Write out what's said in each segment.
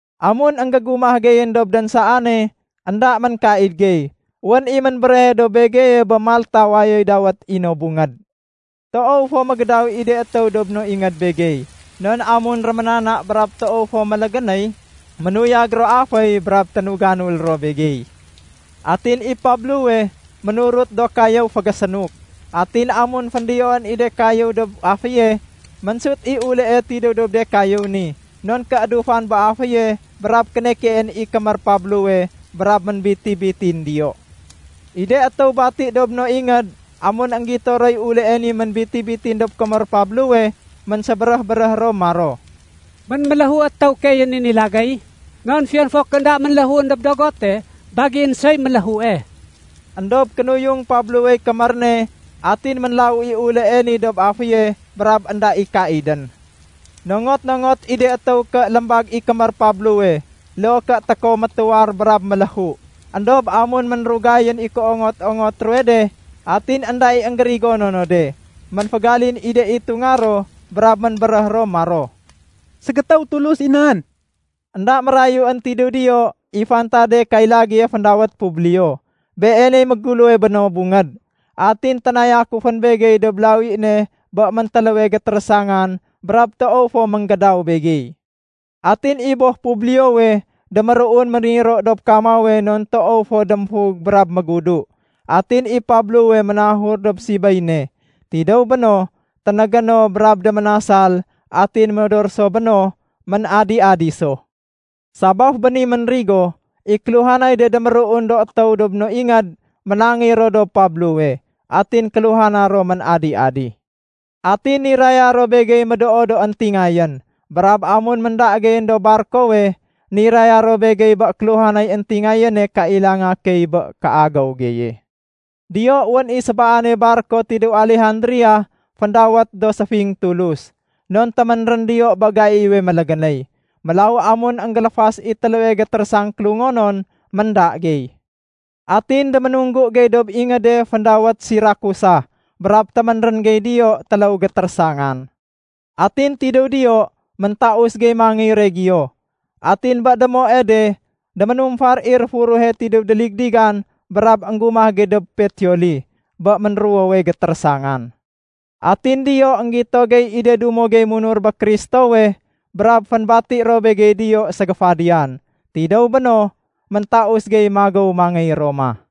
Amun énggégumah geyén dob dénsaane énda ménkaid gey, wén i ménbéréhe dob begeye bé Malta wayoy dawét i no bungéd. Toow fo mégédaw i de étéw dob no ingéd begey. Non amun réménana brab toow fo mélégénéy, ménuyag ro aféy brab ténuganul ro begey. Atin i Pablowe ménurut do kayéw fégésénuk. Atin amun féndiyoén i de kayéw dob aféye, ménsut i ulée tidéw dob de kayéw ni non kéédufan bé aféye brab kénekeén i kémér Pablowe brab ménbiti-bitin diyo. I de étéw bati dob no ingéd amun énggito roy ulée ni ménbiti-bitin dob kémér Pablowe, ménsébéréh-béréh ro maro, “Ménméléhu étéw keeyén i ni lagéy, non fiyon fo ké énda ménléhuén dob dogote, bagién soy méléhue.” Endob kénuyung Pablowey kémér ne atin ménlawu i ulée ni dob aféye brab énda i kaidén. Nongot-nongot i de étéw ké lémbag i kémér Pablowe loo ké tékow métuwar brab méléhu. Endob amun ménrugayén i kéongot-ongot ruwe de atin énda i énggérigono no de, ménfégalin i de itunga ro brab ménbéréh ro maro, “Ségétéw tulus i nan.” Enda mérayuén tidéw diyo i fantade kay lagéye féndawét Publio. Beeney méguléwe bé no bungéd. Atin ténayakufén begey dob lawi ne bé méntéléwe gétérésangan brab toow fo ménggédaw begey. Atin i boh Publiowe déméruun méniro dob kamawe non toow fo démfug brab mégudu. Atin i Pablowe ménahur dob sibéy ne. Tidéw béno, ténégé no brab déménasal atin modor so béno, ménadi-adi so. Sabaf bé ni ménrigo, i kéluhanay de déméruun do étéw dob no ingéd ménangéy ro dob Pablowe. Atin kéluhana ro ménadi-adi. Atin niraya ro begey médoo do éntingayén. Brab amun ménda geyén dob barkowe, niraya ro begey bé kéluhanay éntingayéne kailanga key bé kéagéw geye. Diyo wén i sébaane barko tidéw Alejandria féndawét “Do Séfing Tulus”, non téménrén diyo bé gaiwe mélégénéy. Mélaw amun énggéléfas i téléwe gétérésang kélungonon, ménda gey. Atin déménunggu gey dob ingéde féndawét Sirakusa brab téménrén gey diyo téléw gétérésangan. Atin tidéw diyo, méntaus gey mangéy Regio. Atin bé démoe de déménumfar i réfuruhe tidéw déligdigan brab énggumah gey dob Peteoli bé ménruwowe gétérésangan. Atin diyo énggito gey i de dumo gey munur bé Kristowe brab fénbati ro begey diyo ségéfadiyan. Tidéw béno, méntaus gey magéw mangéy Roma.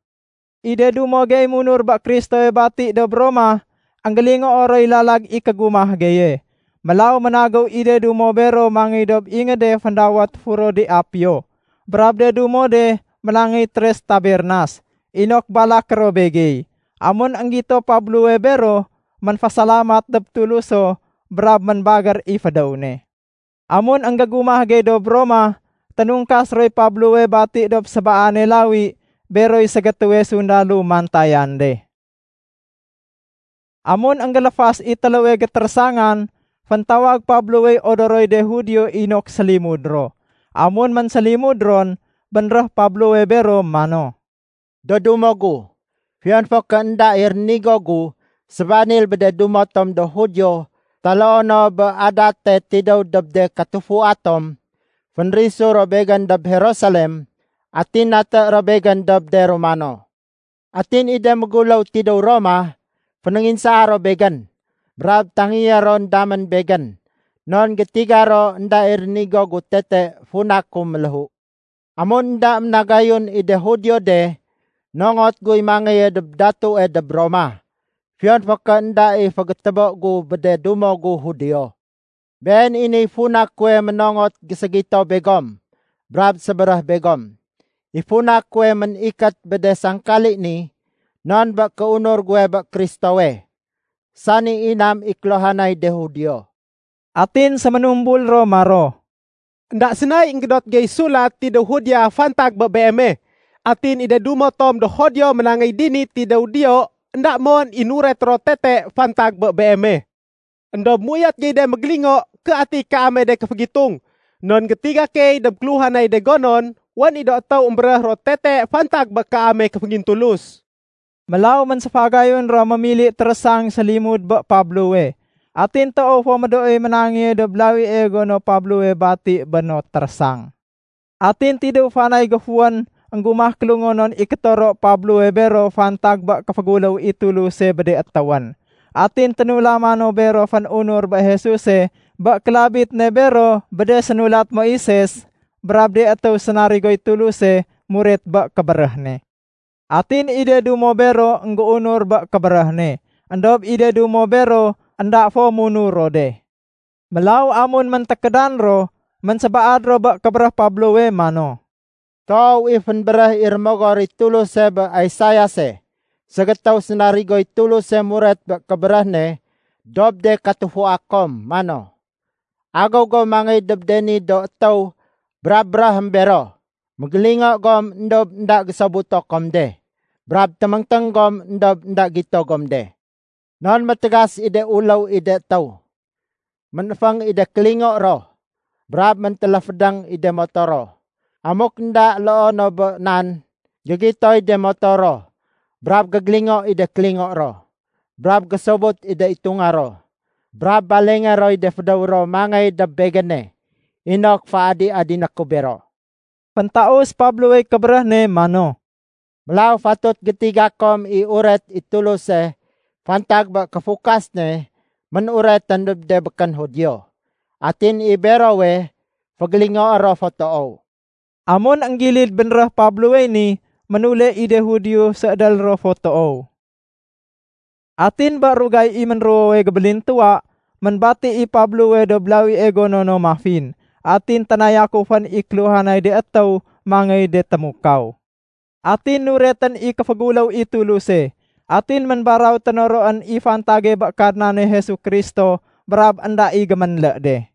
I de dumo gey munur bé Kristowe bati dob Roma, énggélingoo roy lalag i kégumah geye. Mélaw ménagéw i de dumo bero mangéy dob ingéde féndawét “Foro de Apio” brab de dumo de ménangéy “Tres Tabernas” inok balaké ro begey. Amun énggito Pablowe bero, ménfésalamat dob Tuluso brab ménbagér i fédéw ne. Amun énggégumah gey dob Roma, ténungkas roy Pablowe bati dob sébaane lawi beroy ségétéwe sundalo mantayan de. Amun énggéléfas i téléwe gétérésangan, féntawag Pablowey odoroy de Judio inok sélimud ro. Amun ménsélimud ron, bénréh Pablowe bero mano, “Do dumo gu, fiyon fo ké énda i rénigo gu sébanil bé de dumo tom do Judio taloo no bé adate tidéw dob de katufua tom, fénrisu ro begén dob Jerusalem atin naté ro begén dob de Romano. Atin i de méguléw tidéw Roma fénénginsaa ro begén brab tangéyé ron damén begén non gétiga ro énda i rénigo gu tete funa ku méléhu. Amun énda ménagayun i de Judio de, nongot guy mangéye dob datue dob Roma, fiyon fo ké énda i fégétébo gu bé de dumo gu Judio. Been i niy funa kuwe ménongot géségito begom brab sébéréh begom. I funa kuwe ménikét bé de sangkali ni non bé kéunur guwe bé Kristowe, sani inam i kéluhanay de Judio.” Atin séménumbul ro maro, “Enda sénay énggédot gey sulat tidéw Judea fantag bé beeme. Atin i de dumo tom do Judio ménangéy dini tidéw diyo énda mon i nuret ro tete fantag bé beeme. Endob méuyot gey mégélingo ké ati kaame de kéfégitung non gétiga key dob kéluhanay de gonon, wén i do étéw émbéréh ro tete fantag bé kaame kéféngintulus.” Mélaw ménséfagayun ro mémili térésang sélimud bé Pablowe. Atin toow fo médooy ménangéye dob lawie gono Pablowe bati bé no térésang. Atin tidéw fanay géfuwén énggumah kélungonon i kétoro Pablowe bero fantag bé kéféguléw i Tuluse bé de étéwén. Atin ténulama no bero fén-unur bé Jesuse bé kélabit ne bero bé de sénulat Moises brab de étéw sénarigoy Tuluse muret bé kébéréh ne. Atin i de dumo bero énggéunur bé kébéréh ne, éndob i de dumo bero énda fo munur ro de. Mélaw amun méntékédan ro, ménsébaad ro bé kébéréh Pablowe mano, “Toow i fénbéréh i Rémogor i Tuluse bé Isaiase ségétéw sénarigoy Tuluse muret bé kébéréh ne dob de katufua kom, mano, ‘Agéw go mangéy dob de ni do étéw brab béréhém bero, Mégélingo gom éndob énda gésobuto kom de, brab téméngténg gom éndob énda gito gom de. Non métégas i de uléw i de étéw. Ménéféng i de kélingo ro, brab méntéléfédéng i de moto ro. Amuk énda loo no bé nan, gégitoy de moto ro, brab gégélingo i de kélingo ro, brab gésobut i de itunga ro, brab balengé roy de fédéw ro mangéy dob Begéne inok féadi-adiné ku bero.’” Féntaus Pablowey kébéréh ne mano, “Mélaw fatut gétiga kom i uret i Tuluse fantag bé kéfukas ne ménuretén dob de békén Judio. Atin i berowe fégélingoé ro fo toow.” Amun énggilid bénréh Pablowey ni, ménule i de Judio séédél ro fo toow. Atin bé rugay i ménruwowe gébélintuwa, ménbati i Pablowe dob lawie gono no mafin. Atin ténayakufén i kéluhanay de étéw mangéy de témukaw. Atin nuretén i kéféguléw i Tuluse, atin ménbaraw ténoroén i fantage bé Kadnane Jesu Kristo brab énda i géménlé de.